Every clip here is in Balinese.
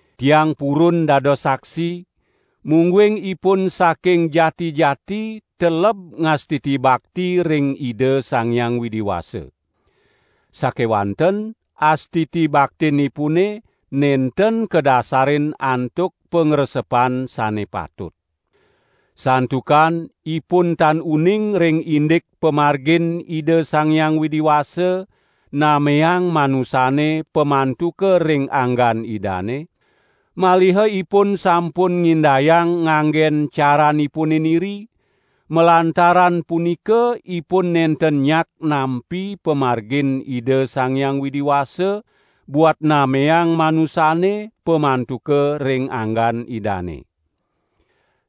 Tiang purun dados saksi, mungguing ipun saking jati-jati teleb ngastiti bakti ring Ida Sang Hyang Widi Wasa. Sakewanten astiti baktinipune nenten kadasarin antuk pangresepan sane patut. Santukan ipun tan uning ring indik pamargin Ida Sang Hyang Widi Wasa nameang manusane pamantuka ring anggan Idane, maliha ipun sampun ngindayang nganggen caranipune niri, malantaran punika ipun nenten nyak nampi pamargin Ida Sang Hyang Widi Wasa buat nameang manusane pamantuka ring anggan Idane.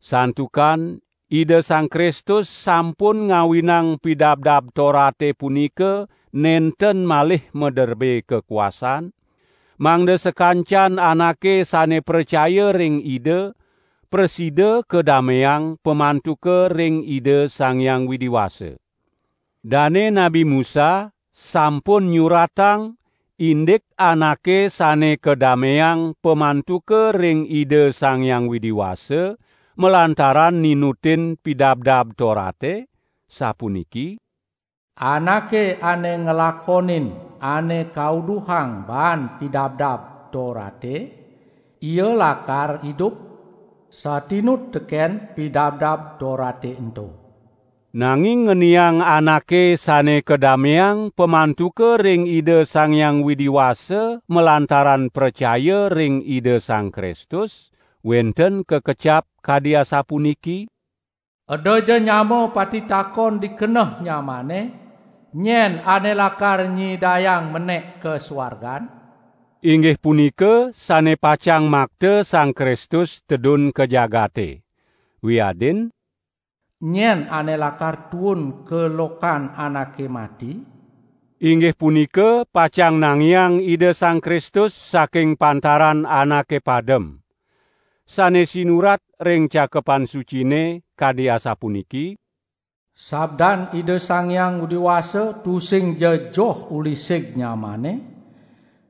Santukan Ida Sang Kristus sampun ngawinang Pidabdab Torate punika nenten malih maderbe kakuasaan, mangda sakancan anake sane pracaya ring Ida, prasida kadameang pamantuka ring Ida Sang Hyang Widi Wasa. Dane Nabi Musa sampun nyuratang indik anake sane kadameang pamantuka ring Ida Sang Hyang Widi Wasa malantaran ninutin Pidabdab Torate, sapuniki: "Anake ane nglakonin ane kauduhang baan Pidabdab Torate, ia lakar idup satinut teken Pidabdab Torate ento." Nanging ngeniang anake sane kadameang pamantuka ring Ida Sang Hyang Widi Wasa malantaran pracaya ring Ida Sang Kristus, wenten kakecap kadi asapuniki: "Edaja nyama patitakon di keneh nyamane, nyen ane lakar nyidayang menek ka suargan?" (Inggih punika sane pacang makta Sang Kristus tedun ka jagate.) Wiadin: "Nyen ane lakar tuun ka lokan anake mati?" (Inggih punika pacang nangiang Ida Sang Kristus saking pantaran anake padem.) Sane sinurat ring Cakepan Sucine kadi asapuniki: "Sabdan Ida Sang Hyang Widi Wasa tusingja joh uli sig nyamane,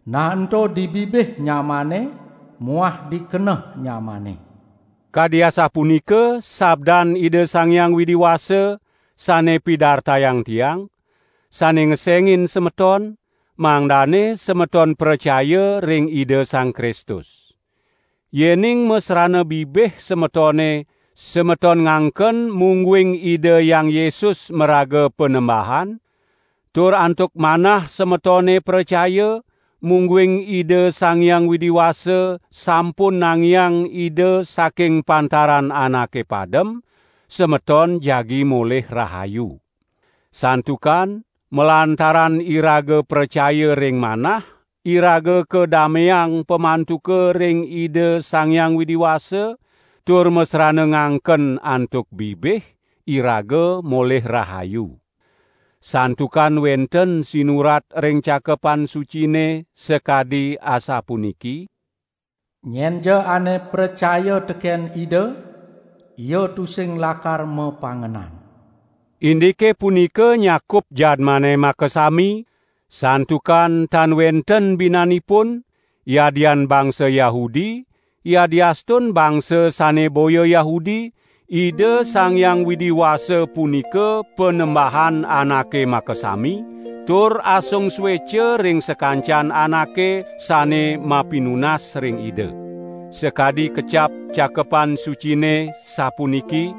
nah ento di bibih nyamane muah di keneh nyamane." Kadi asapunika sabdan Ida Sang Hyang Widi Wasa sane pidartayang tiang, sane ngesengin semeton, mangdane semeton pracaya ring Ida Sang Kristus. Yening masrana bibih semetone, semeton ngangken mungguing Ida Hyang Yesus maraga Panembahan, tur antuk manah semetone pracaya, mungguing Ida Sang Hyang Widi Wasa sampun nangiang Ida saking pantaran anake padem, semeton jagi molih rahayu. Santukan malantaran iraga pracaya ring manah, iraga kadameang pamantuka ring Ida Sang Hyang Widi Wasa; tur masrana ngangken antuk bibih, iraga molih rahayu. Santukan wenten sinurat ring Cakepan Sucine, sakadi asapuniki: "Nyenja ane pracaya teken Ida, ia tusing lakar mapangenan." Indike punika nyakup jadmane makasami, santukan tan wenten binanipun, yadian bangsa Yahudi, yadiastun bangsa sane boya Yahudi; Ida Sang Hyang Widi Wasa punika Panembahan anake makasami, tur asung sueca ring sakancan anake sane mapinunas ring Ida. Sakadi kecap Cakepan Sucine, sapuniki: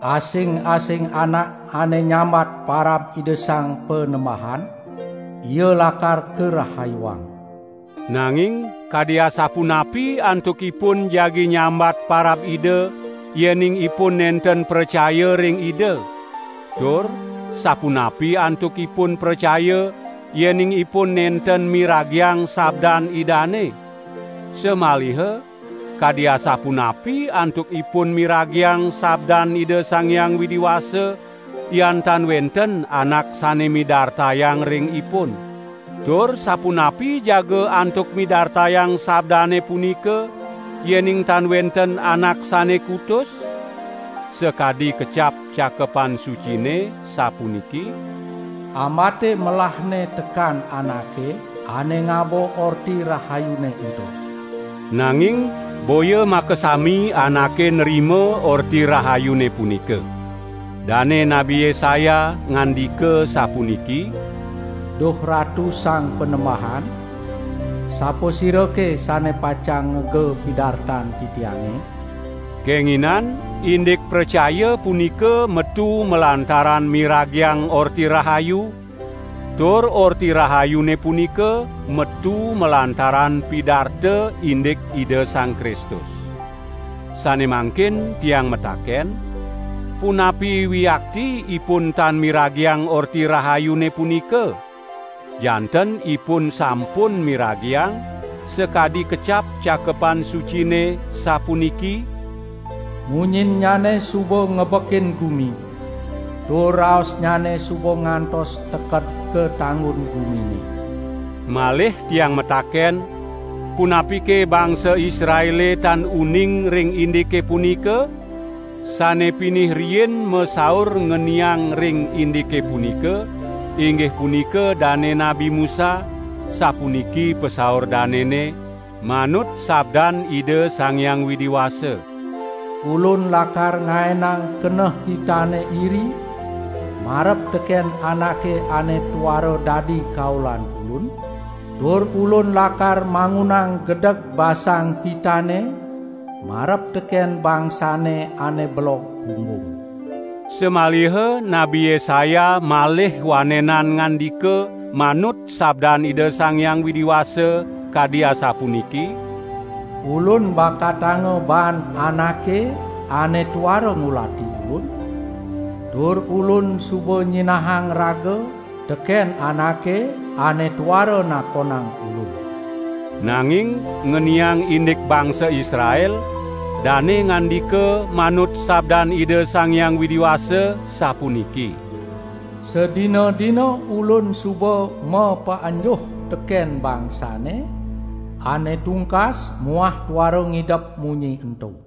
"Asing-asing anak ane nyambat parab Ida Sang Panembahan, ia lakar karahayuang." Nanging kadi asapunapi antukipun jagi nyambat parab Ida, yening ipun nenten pracaya ring Ida? Tur sapunapi antukipun pracaya, yening ipun nenten miragiang sabdan Idane? Samaliha kadi asapunapi antukipun miragiang sabdan Ida Sang Hyang Widi Wasa, yan tan wenten anak sane midartayang ring ipun? Tur sapunapi jaga antuk midartayang sabdane punika, yening tan wenten anak sane kutus? Sakadi kecap Cakepan Sucine sapuniki: "Ambate melahne tekan anake ane ngaba Orti Rahayune ento." Nanging boya makasami anake nrima Orti Rahayune punika. Dane Nabi Yesaya ngandika sapuniki: "Duh Ratu Sang Panembahan, sapasirake sane pacang ngega pidartan titiange?" Kenginan indik pracaya punika metu malantaran miragiang Orti Rahayu, tur Orti Rahayune punika metu malantaran pidarta indik Ida Sang Kristus. Sane mangkin tiang mataken: "Punapi wiakti ipun tan miragiang Orti Rahayune punika?" Janten ipun sampun miragiang, sakadi kecap Cakepan Sucine sapuniki: "Munyinnyane suba ngebekin gumi, tur raosnyane suba ngantos teked ka tanggun gumine." Malih tiang mataken: "Punapike bangsa Israele tan uning ring indike punika?" Sane pinih riin masaur ngeniang ring indike punika, inggih punika dane Nabi Musa, sapuniki pasaur danene, manut sabdan Ida Sang Hyang Widi Wasa: "Ulun lakar ngaenang keneh kitane iri marep teken anake ane tuara dadi kaulan Ulun, tur Ulun lakar mangunang gedeg basang kitane marep teken bangsane ane belog punggung." Samaliha Nabi Yesaya malih wanenan ngandika manut sabdan Ida Sang Hyang Widi Wasa kadi asapuniki: "Ulun bakatanga baan anake ane tuara ngulati Ulun, tur Ulun suba nyinahang raga teken anake ane tuara nakonang Ulun." Nanging ngeniang indik bangsa Israel, dane ngandika manut sabdan Ida Sang Hyang Widi Wasa sapuniki: "Sadina-dina Ulun suba mapaenjuh teken bangsane ane tungkas muah tuara ngidep munyi ento."